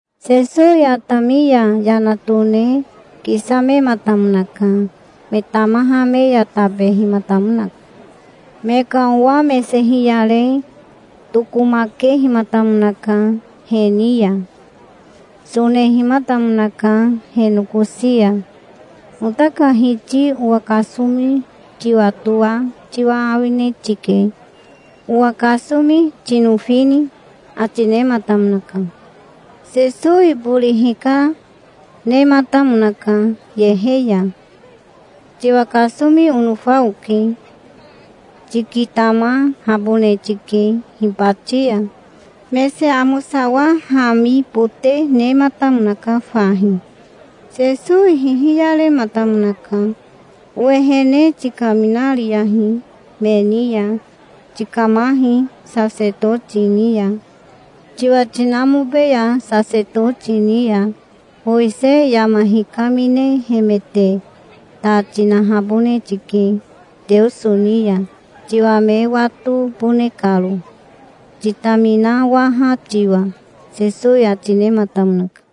Sesowi atami ya yana tone kisamematamonaka. Me tamaha me ya tabehimatamonaka. Me ka owa mese hiyare tokomakehimatamonaka he ni ya. Sonehimatamonaka he nokosi ya. "Ota ka Hiti owa kasomi tiwatoa tiwa awine tike. Owa kasomi tinofini?" ati nematamonaka. Sesowi bori hikanematamonaka yehe ya. "Tiwa kasomi onofa oke. Tikitamahabone tike hibati ya". Mese amosawahamibote nematamonaka fahi. Sesowi hihiyarehimatamonaka. "Owehene tikaminariyahi me ni ya. Tikamahi sasetoti ni ya, tiwa tinamobeya sasetoti ni ya. Mowisei yama hikaminehemete ta tinahabone tike Teoso ni ya, tiwa me watobone karo, titaminawaha tiwa", Sesowi ati nematamonaka.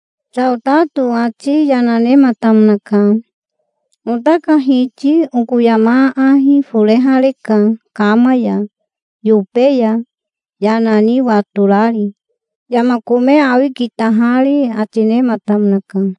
Saotato ati yana nematamonaka. "Ota ka Hiti oko yama aahi forehareka kama ya, yobe ya, yana ni watorari, yama kome awi kitahari", ati nematamonaka.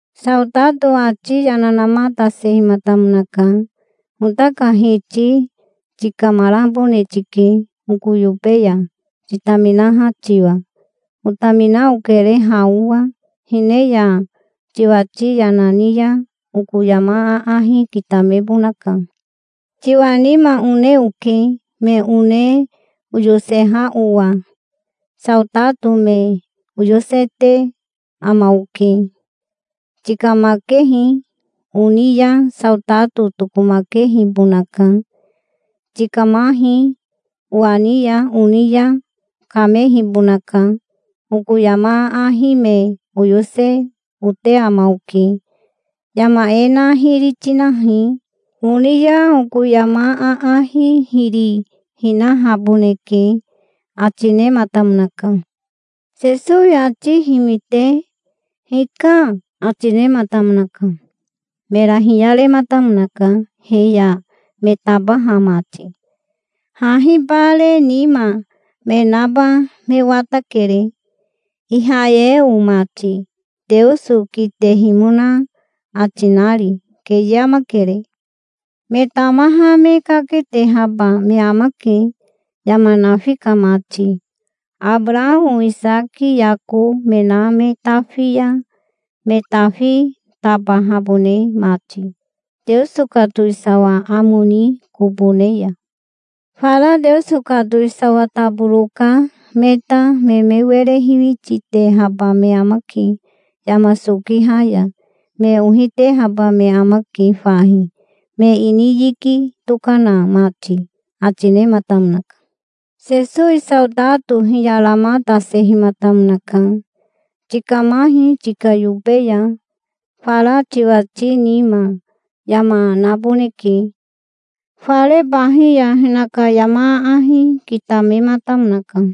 Saotato ati yana namatasehimatamonaka. "Ota ka Hiti tikamarabone tike oko yobe ya, titaminaha tiwa. Otamina okere ha owa. Hine ya tiwati yana ni ya oko yama aahi kitamebonaka. Tiwa nima one oke, me one oyoseha owa. Saotato me oyosete ama oke. 'Tikamakehi', oni ya saotato tokomakehibonaka. 'Tikamahi', owa ni ya oni ya kamehibonaka. Oko yama aahi me oyose ote ama oke. 'Yama e na hiri tinahi', oni ya oko yama aahi hiri hinahaboneke", ati nematamonaka. Sesowi ati himite "Hika", ati nematamonaka. Mera hiyarematamonaka he ya me tabaha mati. "Hahi bare nima me naba me watakere, Ihayeo mati, Teoso kitehimona ati nari. Keye amakere. Me tamaha me kaketehaba me amake, yama nafi ka mati, Abarao Isaki Yako me na me tafi ya me tafi tabahabone mati, Teoso ka towisawa amo ni kobo ne ya. Fara Teoso ka towisawa taboro ka me ta me me were hiwititehaba me amake yama sokiha ya. Me ohi tehaba me amake fahi, me ini yiki tokana mati", ati nematamonaka. Sesowi saotato hiyaramatasehimatamonaka. "Tikamahi tika yobe ya. Fara tiwati nima yama naboneke". Fare bahi ya hinaka yama aahi kitamematamonaka.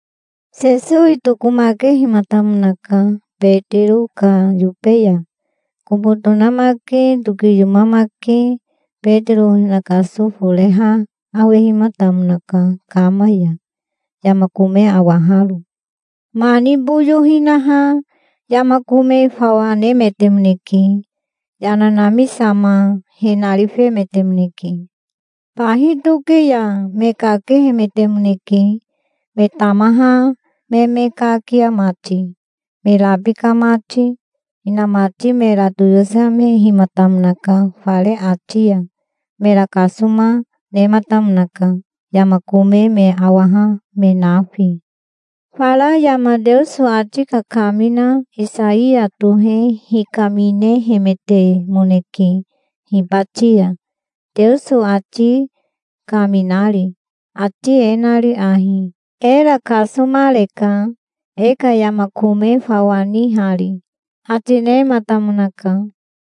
Sesowi tokomakehimatamonaka Betiro ka yobe ya. Kobo tonamake tokiyomamake Betiro hinakaso foreha awehimatamonaka, kama ya, yama kome awaharo. Mani boyo hinaha yama kome fawa nemetemoneke. Yana namisama he narifemetemoneke. Bahi toke ya me kakehemetemoneke, me tamaha me me kakia mati, me rabika mati. Inamati mera toyosemehimatamonaka fare ati ya. Mera kasoma nematamonaka, yama kome me awaha me nafi. Fara yama Teoso ati kakamina Isaiya tohe hikaminehemetemoneke hibati ya, Teoso ati kaminari, ati e nari ahi: "Era kasomareka, e ka yama kome fawa nihari", ati nematamonaka.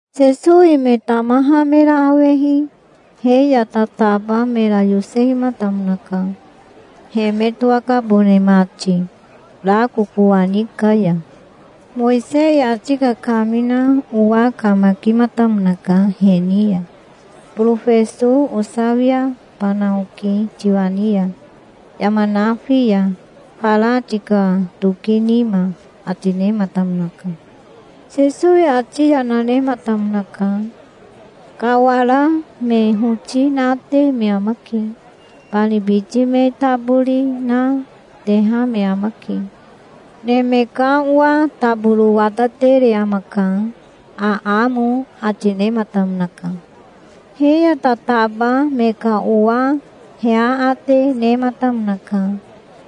Sesowi me tamaha mera awehi he ya tataba mera yosehimatamonaka, he me towakabone mati rako kowani ka ya. Mowisei ati kakamina owa kamakimatamonaka he ni ya. "Borofeso osawiabana oke tiwa ni ya, yama nafi ya, fara tika toki nima", ati nematamonaka. Sesowi ati yana nematamonaka. "Kawara me hoti nate me amake. Bani biti me tabori na, teha me amake. Neme ka Owa taboro watatere amaka, aamo", ati nematamonaka. He ya tataba me ka owa he aate nematamonaka.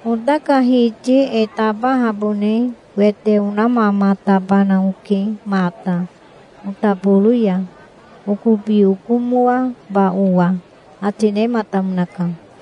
"Ota ka Hiti e tabahabone wete onamamatabana oke mata, otaboro ya, okobi okomoaba owa", ati nematamonaka.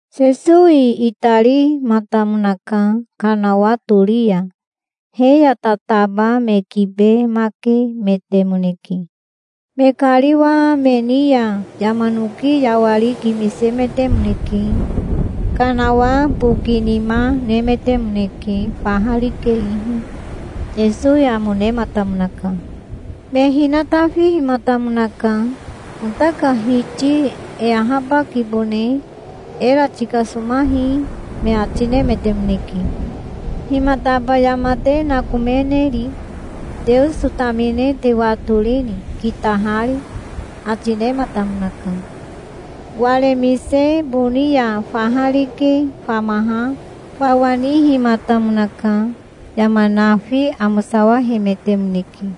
Sesowi itarimatamonaka kanawa tori ya. He ya tataba me kibemakemetemoneke. Me kariwa me ni ya yama noki yawari kimisemetemoneke. Kanawa bokinima nemetemoneke faha rike ihi. Sesowi amo nematamonaka. Me hinatafihimatamonaka. "Ota ka Hiti e ahabakibone. Era tikasomahi", me ati nemetemoneke. "Himataba yama te nakomeneri? Teoso tamine te watorini, kitahari?" ati nematamonaka. Waremise boni ya faha rike famaha fawa nihimatamonaka. Yama nafi amosawahemetemoneke.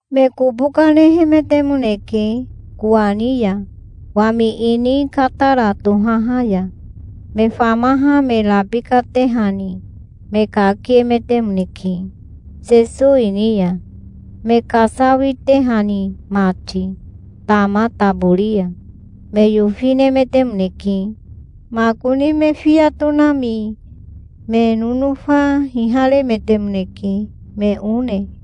Me kobo kanehemetemoneke kowani ya, wami ini Katara tohaha ya. Me famaha me rabikatehani me kakiemetemoneke Sesowi ni ya, me kasawitehani mati tama tabori ya. Me yofinemetemoneke. Makoni me fiya tonami me nonofa hiharemetemoneke, me one.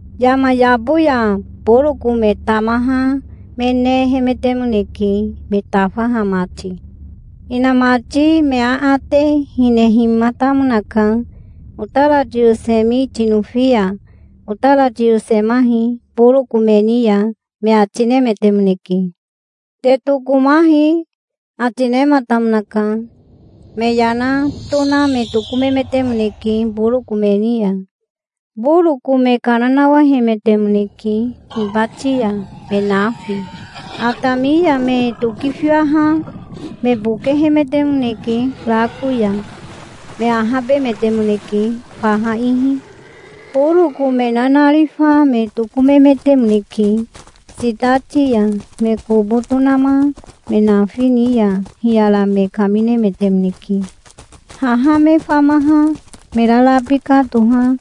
Yama yabo ya boroko me tamaha me nehemetemoneke, me tafaha mati. Hinamati me aate hinehimatamonaka. "Otara toyosemi tinofi ya otara tiyosemahi boroko me ni ya", me ati nemetemoneke. "Te tokomahi", ati nematamonaka. Me yana tona me tokomemetemoneke boroko me ni ya. Boroko me kana nawahemetemoneke hibati ya, me nafi. Atami ya me tokifiwaha me bokehemetemoneke rako ya. Me ahabemetemoneke faha ihi. Boroko me nanarifa me tokomemetemoneke. Sitati ya me kobo tonama me nafi ni ya hiyara me kaminemetemoneke. Haha me famaha me rarabika toha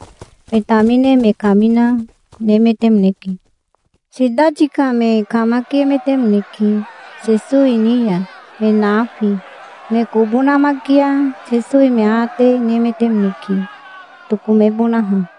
me tamine me kamina, nemetemoneke. Sitati ka me kamakiemetemoneke Sesowi ni ya, me nafi. Me kobo namakia Sesowi me aate nemetemoneke, tokomebonaha.